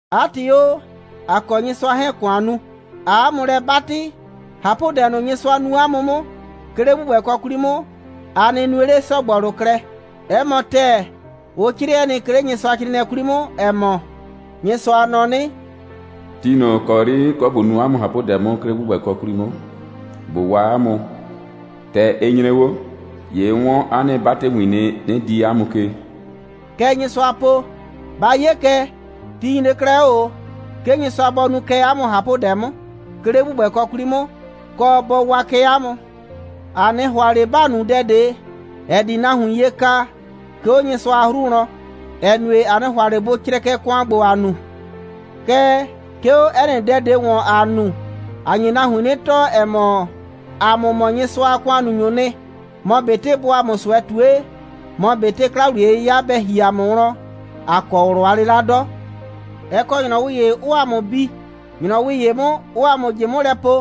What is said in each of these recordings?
'A ‑tɩ o, ‑a kɔ Nyɩsʋa 'hɛɛn‑ ‑kʋan nu, ꞊aa 'a mʋ lɛ 'batɩ, ꞊hapʋdɛ ꞊nʋ, Nyɩsʋa nu 'a mʋ 'mʋ, 'ke 'le ‑gbʋgbɛkɔ 'kwli 'mʋ, a nɩ nue 'le ‑sɔgbɔlʋ klɛ. 'Ɛ mɔ ‑tɛɛ, ʋ 'crɩɛ nɩ, 'ke 'le Nyɩsʋacrɩɩnɩɛ 'kwli 'mʋ, ‑ɛ mɔ: «Nyɩsʋa nɔ 'nɩ: ti ꞊nʋ ‑kɔ 'yri 'n kɔ ꞊bo nu 'a mʋ ꞊hapʋdɛ 'mʋ, 'ke 'le ‑gbʋgbɛkɔ 'kwli 'mʋ, ꞊bo waa 'a mʋ, ‑tɛ ɩ nyre 'o, ‑ye 'n 'wɔn 'a nɩ 'batɩwin nɩ, 'nɩ dii 'a mʋ ke.» Kɛ Nyɩsʋaa po. Ba 'ye kɛ, ti nyre 'klɛɛ 'o ꞊o, 'ke Nyɩsʋa bɔ nu kɛ 'a mʋ ꞊hapʋdɛ 'mʋ, 'ke 'le ‑gbʋgbɛkɔ 'kwli 'mʋ, kɔ, bɔ waa kɛ 'a mʋ. ‑A 'nɩ ‑hʋa ꞊le ‑ba nu dɛ ꞊de, ‑ɛ di nahuin ye ka, 'ke 'o Nyɩsʋa a 'hru wlɔn, ‑ɛ nue, ‑a 'nɩ ‑hʋa ꞊le bʋ crɛkɛ ‑kʋan ‑gbo, ‑aa nu. Kɛɛ, 'ke 'o 'ɛ nɩ dɛ ꞊de ‑wɔn, ‑aa nu, ‑a nye nahuin 'nɩ tɔɔ, ‑ɛ mɔ, ‑a mʋ mɔ Nyɩsʋa a ‑kʋannunyʋʋ nɩ. Mɔ ꞊betɩ bʋʋ ‑a mʋ ꞊sʋɛ ꞊tue, mɔ ꞊betɩ 'kla‑wliye'yɩya bɛ ‑hi ‑a mʋ wlɔn, ‑a kɔ ꞊wlʋ a 'lɩla 'dɔ. Ɛ kɔ ‑nyrɔwɩ ‑ye, 'ʋʋ ‑a mʋ bi, ‑nyrɔwɩ ‑ye 'mʋ, 'ʋʋ ‑a mʋ ꞊jɩ 'mʋ lɛ po,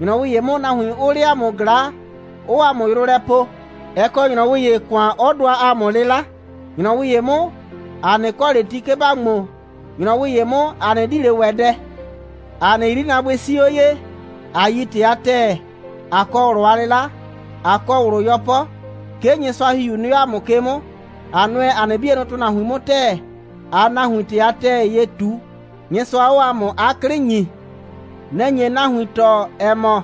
‑nyrɔwɩ ‑ye 'mʋ, nahuin 'ʋʋ 'le ‑a mʋ ꞊glaa, 'ʋʋ ‑a mʋ yrʋ lɛ poo, 'ɛ kɔ ‑nyrɔwɩ ‑ye, ‑kʋan 'ɔ dʋa ‑a mʋ 'lɩla, ‑nyrɔwɩ ‑ye 'mʋ, ‑a 'nɩ kɔ ꞊le ti, 'ke ‑ba ŋmo, ‑nyrɔwɩ ‑ye 'mʋ, ‑a 'nɩ di ꞊le ‑wɛ dɛ. ‑A nɩ 'yrinaabʋɩ 'sii 'o ye, ꞊a yi ‑tɩ a ‑tɛɛ, ꞊a kɔ ꞊wlʋ a 'lɩla, ꞊a kɔ ꞊wlʋ 'yɔpɔ, 'ke Nyɩsʋa a ‑Hihiu nɩ 'o ‑a mʋ ke 'mʋ, ꞊a nʋɛ ‑a nɩ 'bienʋ ‑tʋnahuin 'mʋ ‑tɛɛ, ꞊aa nahuin ‑tɩ a ‑tɛɛ ye ꞊tu, Nyɩsʋa 'ɔɔ ‑a mʋ 'a 'klɩ ‑nyi. Nɛ‑ nye nahuin tɔɔ, ‑ɛ mɔ,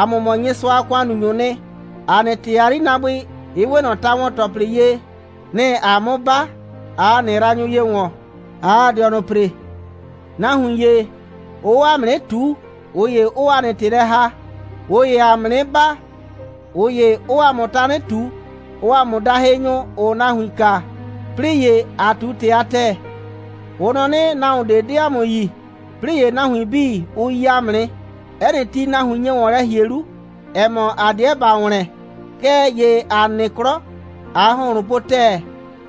‑a mʋ mɔ Nyɩsʋa a ‑kʋannunyʋʋ nɩ. ‑A nɩ ‑tɛɛ a 'yrinaabʋɩ, ɩ 'we ꞊nɔ ta‑wɔn‑tɔplɩ ye. Nɩ‑ ‑aa 'mʋ 'ba, ꞊aa ‑a nɩ yraanyʋ ye ‑wɔn, ꞊aa ‑a dɩɔnʋ ‑pre. Nahuin ‑ye, ʋʋ 'o ‑a mʋ 'nɩ ꞊tuu, ꞊ʋ ‑ye 'ʋʋ ‑a nɩ ‑tɩ lɛ ‑haa. ꞊Ʋ ‑yee ‑a mʋ 'nɩ baa, ꞊ʋ ‑ye 'ʋʋ ‑a mʋ tanɩ ꞊tu. Ʋʋ ‑a mʋ daa hɩnyʋ, ‑ʋʋ nahuin kaa, 'plɩɩ ‑ye, ‑aa ꞊tu ‑tɩ a ‑tɛɛ. Ʋ nɔ 'nɩ, nahuon ꞊de 'de ‑a mʋ yi, 'plɩɩ ‑ye, nahuin 'bii, ʋ yi ‑a mʋ nɩ. 'Ɛ nɩ ti, nahuin nye ‑wɔn lɛ ‑hie 'lu, ‑ɛ mɔ, ‑a 'deɛ ‑ba ‑wlɛn, kɛɛ ‑ye ‑a nɩ 'klɔ, ꞊aa ‑hʋnhlʋn po ‑tɛɛ.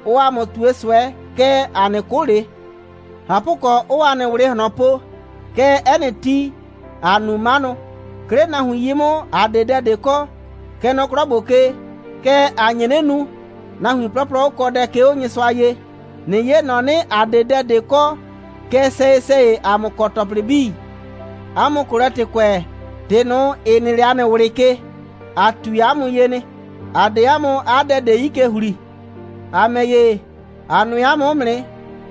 Ʋʋ ‑a mʋ ꞊tue ꞊sʋɛ, kɛɛ, ‑a 'nɩ 'kʋ ꞊le. ꞊Hapʋkɔ, 'ʋʋ ‑a nɩ ꞊wlɩ ꞊hlɔn po, kɛɛ, 'ɛ nɩ ti, ‑aa nu 'manʋ. 'Ke 'le nahuin 'yi 'mʋ, ‑a 'de dɛ ꞊de kɔ, kɛ nɔ 'klɔ ‑gbo ke, kɛɛ, ‑a nye 'nɩ nu, nahuin 'plɔplɔ 'ʋ kɔ dɛ, 'ke 'o Nyɩsʋa ye. ꞊Nɩ 'ye ‑nɔ 'nɩ, ‑a 'de dɛ ꞊de kɔ, kɛɛ, sɛyɩ‑sɛyɩ ‑a mʋ kɔ ‑tɔplɩ 'bii. 'A mʋ Kolɛtɩkʋɛ, ‑tɩ ꞊nʋ, ‑ɩ nɩ 'le ‑a nɩ ꞊wlɩ ke, ‑a ꞊tui 'a mʋ ye nɩ. ‑A 'de 'a mʋ 'a dɛ ꞊de 'yi ke ‑hli. ‑A ‑mɛ ‑ye, ‑a nʋɛ 'a mʋ 'mʋ nɩ.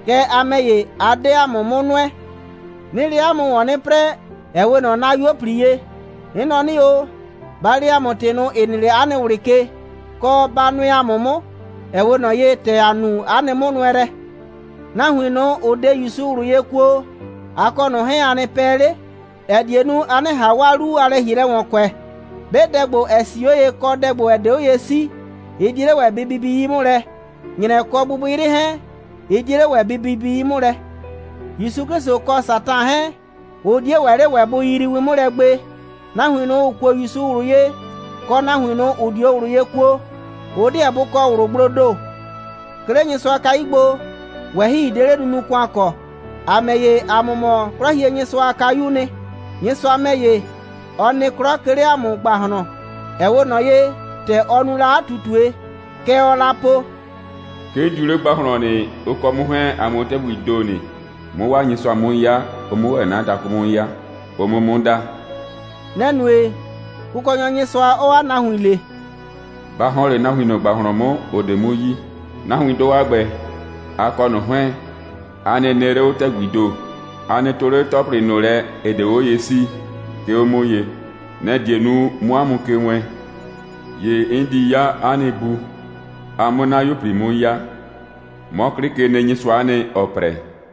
Kɛɛ, a ‑mɛ ‑ye, a 'de ‑a mʋ 'mʋ nʋɛ. 'Nɩɩ 'le 'a mʋ ‑wɔn 'nɩ 'prɛɛ, ‑ɛ 'we ꞊nɔ 'na 'yuo꞊pli ye. 'N nɔ 'nɩ o: Ba le ‑a mʋ ‑tɩ ꞊nʋ, ‑ɩ nɩ 'le 'a nɩ ꞊wlɩ ke, kɔ, ba nʋɛ ‑a mʋ 'mʋ, ‑ɛ 'we ꞊nɔ ye, ‑tɛ ‑a nu 'a nɩ 'mʋnʋɛlɛ. Nahuin ꞊nʋ, ‑ʋ 'de ‑Yusu ꞊wlʋ ye kuo, a kɔ ꞊nʋ 'hɛɛn, a nɩ pɛ 'le, ‑ɛ die nu, a 'nɩ ꞊han 'waa 'lu a lɛ‑hielɛ ‑wɔn kʋɛ. 'Be dɛ ‑gbo, ‑ɛ 'sii 'o ye, kɔ dɛ ‑gbo, ‑ɛ 'de 'o ye 'sii, ɩ 'die 'le ‑wɛ bɩ bibi 'yi 'mʋ lɛ. ‑Nyrɛ kɔ gbɩgbɩyrɩ 'hɛɛn, ɩ 'die 'le ‑wɛ bɩ bibi 'yi 'mʋ lɛ. ‑Yusu 'Klɩsʋ kɔ Satan 'hɛɛn, ʋ 'die ‑wɛ 'le ‑wɛ bʋ yiyrii win 'mʋ lɛ gbe. Nahuin ꞊nʋ, ‑ʋ kuo ‑Yusu ꞊wlʋ ye, kɔ, nahuin ꞊nʋ, ‑ʋ 'dio ꞊wlʋ ye kuo, ʋ 'deɛ bʋ kɔ ꞊wlʋgbloo ‑do. 'Ke 'le Nyɩsʋa a kayu gbo, ꞊wɛhɩi 'de 'le nunu‑kʋan kɔ. ‑A ‑mɛ ‑ye, ‑a mɔ mɔ 'Klɔhienyɩsʋa a kayuu nɩ. Nyɩsʋa ‑mɛ ‑ye, ɔ nɩ 'klɔ, 'ke 'le ‑a mʋ ‑gbahlɔn, ‑ɛ 'we ꞊nɔ ye, ‑tɛ ɔ nu la 'a ꞊tutue. Kɛ ɔɔ la po: «'Ke 'n diu 'le ‑gbahlɔn nɩ, ʋ kɔ 'mʋ 'hɛɛn, ‑a 'mʋ 'o ‑tɛgbii ‑do nɩ, 'mʋ 'waa Nyɩsʋa 'mʋ 'ya, ʋ 'mʋ ‑wɛ 'na dakʋ 'mʋ 'ya, ʋ 'mʋ 'mʋ da.» Nɛ‑ nue, Kʋkɔnyɔ Nyɩsʋa 'ɔɔ 'a nahuin le: «Ba ‑hɔn 'le nahuin ꞊nʋ ‑gbahlɔn 'mʋ, ‑ʋ 'de 'mʋ yi. Nahuindʋ a ‑gbɛ, a kɔ ꞊nʋ 'hɛɛn, a nɩ nɩ 'le 'o ‑tɛgbii ‑do. A nɩ 'tʋ 'le ‑tɔplɩ ꞊nʋ lɛ, ‑ɩ 'de 'o ye 'sii, 'ke 'o 'mʋ ye. Nɛ‑ die nu, 'mʋ 'a mʋ ke wɛɛn. ‑Ye 'n di 'ya 'a nɩ Bu, a 'mʋ 'na 'yuo꞊pli 'mʋ 'ya. 'Mɔ 'Klɩkenɩnyɩsʋa'a nɩ, ‑ɔɔ 'prɛ.»